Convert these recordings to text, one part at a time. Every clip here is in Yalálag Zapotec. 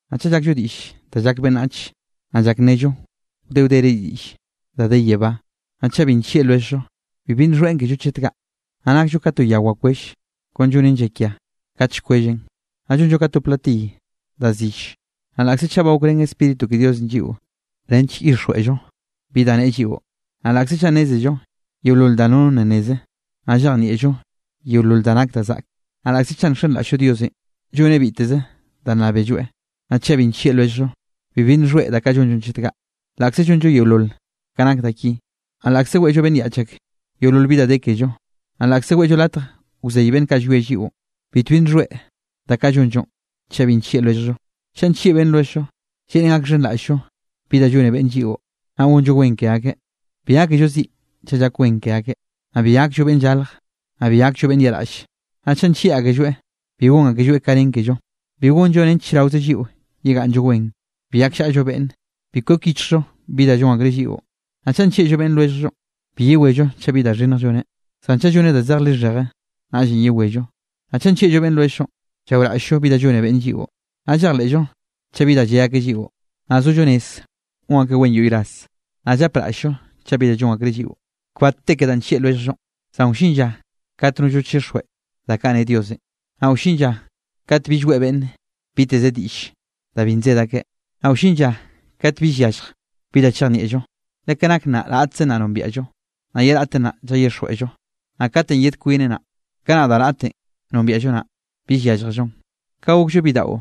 Naꞌ chaꞌ llakllo diꞌll da llak beꞌnnach, naꞌ llak nnello wde wdere diꞌll da de yebá, naꞌ chaꞌ bi nllieꞌ lwelljllo, bibi nxhoeꞌn kello chet kaꞌ. Naꞌ nakllo ka to ya wakwell, kon llonen llakia kat llkwelleꞌn, naꞌ llonllo ka to platiy da zill. Naꞌ laꞌkze chaꞌ ba gokrén Spíritu ke Diosenꞌ lliꞌo nench llyixjweꞌllo bi da neꞌe lliꞌo, naꞌ laꞌkze chaꞌ nnézello yeolol da nono nna nneze, naꞌ llejnieꞌllo yeolol da nak da zaꞌke, naꞌ laꞌkze chaꞌ nxenraꞌll-llo Diosenꞌ lloneꞌ biteze da nnábelloeꞌ, naꞌ chaꞌ bi nllieꞌ lwelljllo, bibi nxhoeꞌ da kaꞌ llonllonꞌ chet kaꞌ, laꞌkze llonllo yeolol ka nak da ki. Naꞌ laꞌkze weꞌllo beꞌnn yaꞌch ake yeolol bi da de kello, naꞌ laꞌkze weꞌllo latj wzey beꞌnn kaꞌ llwie lliꞌon, bitbi nxhoeꞌ da kaꞌ llonllonꞌ chaꞌ bi nllieꞌ lwelljllo. Chaꞌ nllieꞌ beꞌnn lwelljllo, lleꞌnen gakxhenraꞌll-llo bi da llone beꞌnn lliꞌo, naꞌ gonllo wen ke akeꞌ, bi gákello ziꞌ chaꞌ llak wen ke akeꞌ, naꞌ bi gakllo beꞌnn llalj, naꞌ bi gakllo beꞌnn yaꞌraꞌlle. Naꞌ chaꞌ nllieꞌ akelloeꞌ, bi gon akelloeꞌ ka nen kello, bi gonllo nench chraoze lliꞌo yegaꞌnnllo wen, bi gakllaꞌllo beꞌnne, bi kwek yichjllo bi da llon akreꞌ lliꞌo. Naꞌ chaꞌ nllieꞌllo beꞌnn lwelljllonꞌ, bi yewello chaꞌ bi da xhinnj lloneꞌ, zan chaꞌ lloneꞌ da zej lixheje, naꞌllenꞌ yewello. Naꞌ chaꞌ nllieꞌllo beꞌnn lwelljllonꞌ, llaoraꞌll-llo bi da llone beꞌnnenꞌ lliꞌo, naꞌ llejleꞌllo chaꞌ bi da lle akeꞌ lliꞌo, naꞌ sollo rez gon akeꞌ wen yoꞌy ras, naꞌ llapraꞌll-llo chaꞌ bi da llon akreꞌ lliꞌo. Kbat te ke danꞌ llieꞌ lwelljllonꞌ, zan wllin lla kate nollno chixjweꞌ da kaꞌ ne Diosenꞌ, naꞌ wllin lla kate bill weꞌe beꞌnne biteze diꞌlle da bi nsed akeꞌ, naꞌ wllin lla kat bill yallj bi da chejnieꞌllo. Le ka nak nnaꞌ raꞌtzen naꞌ nombiaꞌllo, naꞌ ye raꞌtenꞌ naꞌ llayixjweꞌllo. Naꞌ katenꞌ yed kwineꞌ naꞌ, kanaꞌ da raꞌtenꞌ nombiaꞌllo naꞌ, bill yálljellon. Ka gokllo bidaꞌo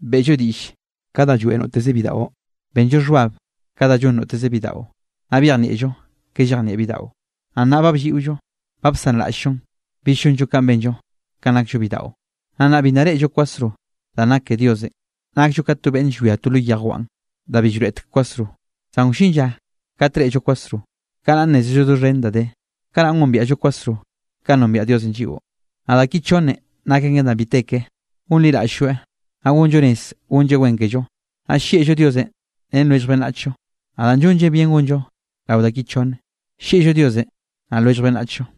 beꞌllo diꞌll ka da lloeꞌ noteze bidaꞌo, benllo xhbab ka da llon noteze bidaꞌo, naꞌ byejnieꞌllo ka llejnieꞌ bidaꞌo. Naꞌ nnaꞌ ba blliꞌollo, ba bsanraꞌll-llonꞌ bill llonllo kanꞌ benllo kanꞌ nakllo bidaꞌo. Naꞌ nnaꞌ bi nna reꞌllo kwasro danꞌ nak ke Diosenꞌ. Nakllo ka to beꞌnne llwia to lo yejwan da bi llroeꞌtek kwasro. Zan wllin lla kat reꞌllo kwasro, kanaꞌ nnézello doxhen da de, kanaꞌn gombiaꞌllo kwasro kanꞌ nombiaꞌ Diosenꞌ lliꞌo. Naꞌ da ki chonnen nak aken da bi te ke: gonliraꞌll-lloeꞌ, naꞌ gonllo rez gonlleꞌ wen kello, naꞌ llieꞌllo Diosenꞌ ren lwellj beꞌnnachllo, Naꞌ da llonllen bien gonllo rao da ki chonne, llieꞌllo Diosenꞌ naꞌ lwellj beꞌnnachllo.